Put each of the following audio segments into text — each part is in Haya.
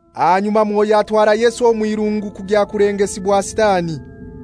Ahanyuma Mwoyo atwara Yesu omw'irungu kugya kulengesibwa Sitani.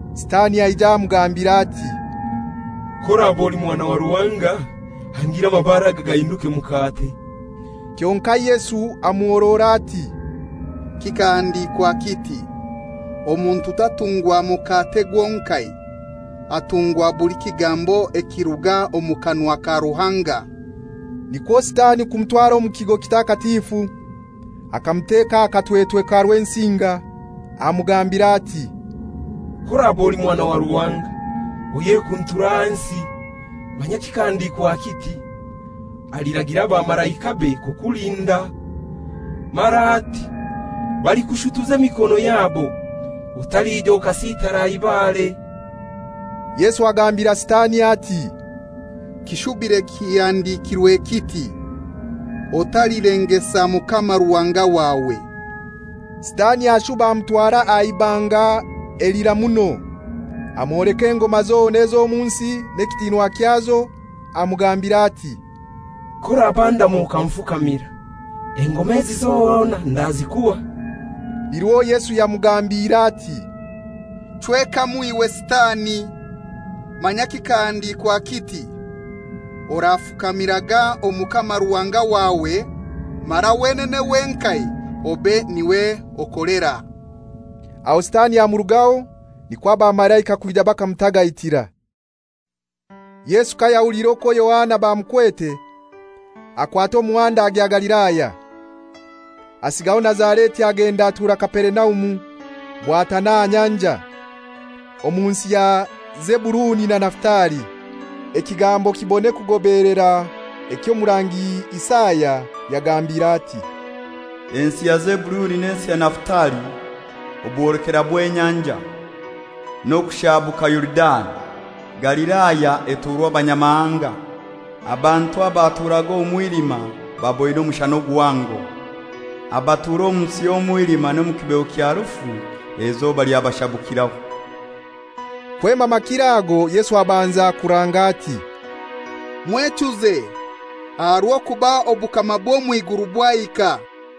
Sitani aija amugambira ati, «K'oraba oli mwana wa Ruhanga hangira amabare aga gahinduke mukate.» Kyonkai Yesu amuhorora ati, «Kikahandikwa kiti, ‹Omuntu tatungwa mukate gwonkai, atungwa buli kigambo ekiruga omu kanwa ka Ruhanga. ›» Nikwo Sitani kumutwara omu kigo kitakatifu, akamuteka aha katwetwe ka Rwensinga. Amugambira ati, «K'oraba oli Mwana wa Ruhanga, oyekunture ahansi; manya kikahandikwa kiti, ‹Aliragira abamalaikabe kukulinda,› mara ati, ‹Balikushutuza emikono yabo, otalija okasitara aha ibare.›» Yesu agambira Sitani ati, «Kishubire kihandikirwe kiti, ‹Otalilengesa Mukama Ruhanga wawe,›» Sitani ashuba amutwara aha ibanga elira muno, amwoleka engoma zona z'omu nsi n'ekitinwa kyazo, amugambira ati, «K'orabandama okanfukamira, engoma ezi zona ndazikuha.» Nirwo Yesu yamugambiire ati, «Chwekamu iwe Sitani! Manya kikahandikwa kiti, ‹Orafukamiraga Omukama Ruhanga wawe, mara wenene wenkai obe niwe okolera.›» Aho Sitani amurugaho, nikwo abamalaika kwija bakamutagaitira. Yesu kayahuliire okwo Yohana bamukwete, akwata omuhanda agya Galilaya. Asigaho Nazareti agenda atura Kaperinaumu bwatana aha nyanja, omu nsi ya Zebuluni na Nafutali, ekigambo kibone kugobeelera eky'Omurangi Isaya yagambire ati, «Ensi ya Zebuluni n'ensi ya Nafutali, obwolekera bw'enyanja, n'okushabuka Yorudani, Galilaya eturwa abanyamahanga: abantu abaturaga omu mwilima baboine omushana guhango. Abatura omu nsi y'omwilima n'omu kibeho kya Rufu eizoba lyabashabukiraho.» Kwema makiro ago, Yesu abanza kuranga ati, «Mwechuze, aha rw'okuba obukama bw'omw'iguru bwahika.»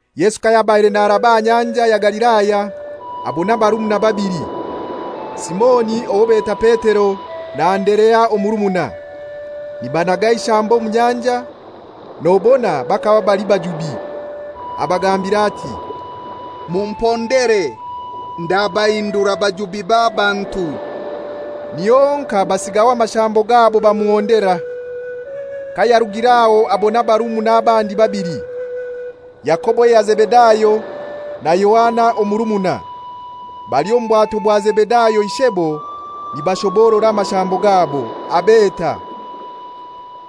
Yesu kayabaire naraba aha Nyanja ya Galilaya, abona abarumuna babili: Simoni owo beta Petero na Anderea omurumuna, nibanaga eishambo omu nyanja, nobona bakaba bali bajubi. Abagambira ati, «Mumpondere, ndabahindura bajubi b'abantu.» Niho honkai basigaho amashambo gabo bamuhondera. Kayarugir'aho abona abarumuna abandi babili: Yakobo eya Zebedayo na Yohana omurumuna, bali omu bwato bwa Zebedayo ishebo nibashoborora amashambo gabo, abeta.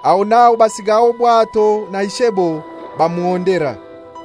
Aho n'aho basigaho obwato na ishebo, bamuhondera.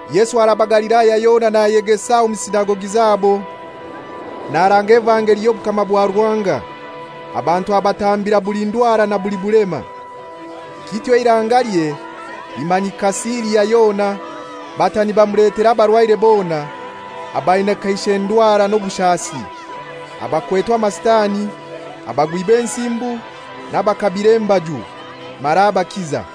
Yesu araba Galilaya yona nayegesa omu sinagogi zabo, naranga amakuru garungi evangeli y'obukama bwa Ruhanga. Abantu abatambira buli ndwara na buli bulema. Kityo eirangalye limanyika Siria yona, bata nibamuletera abarwaire bona, abaina kaishe ndwara n'obushasi, abakwetwe amasitani, abagwi b'ensimbu n'abakabire embaju, mara abakiza.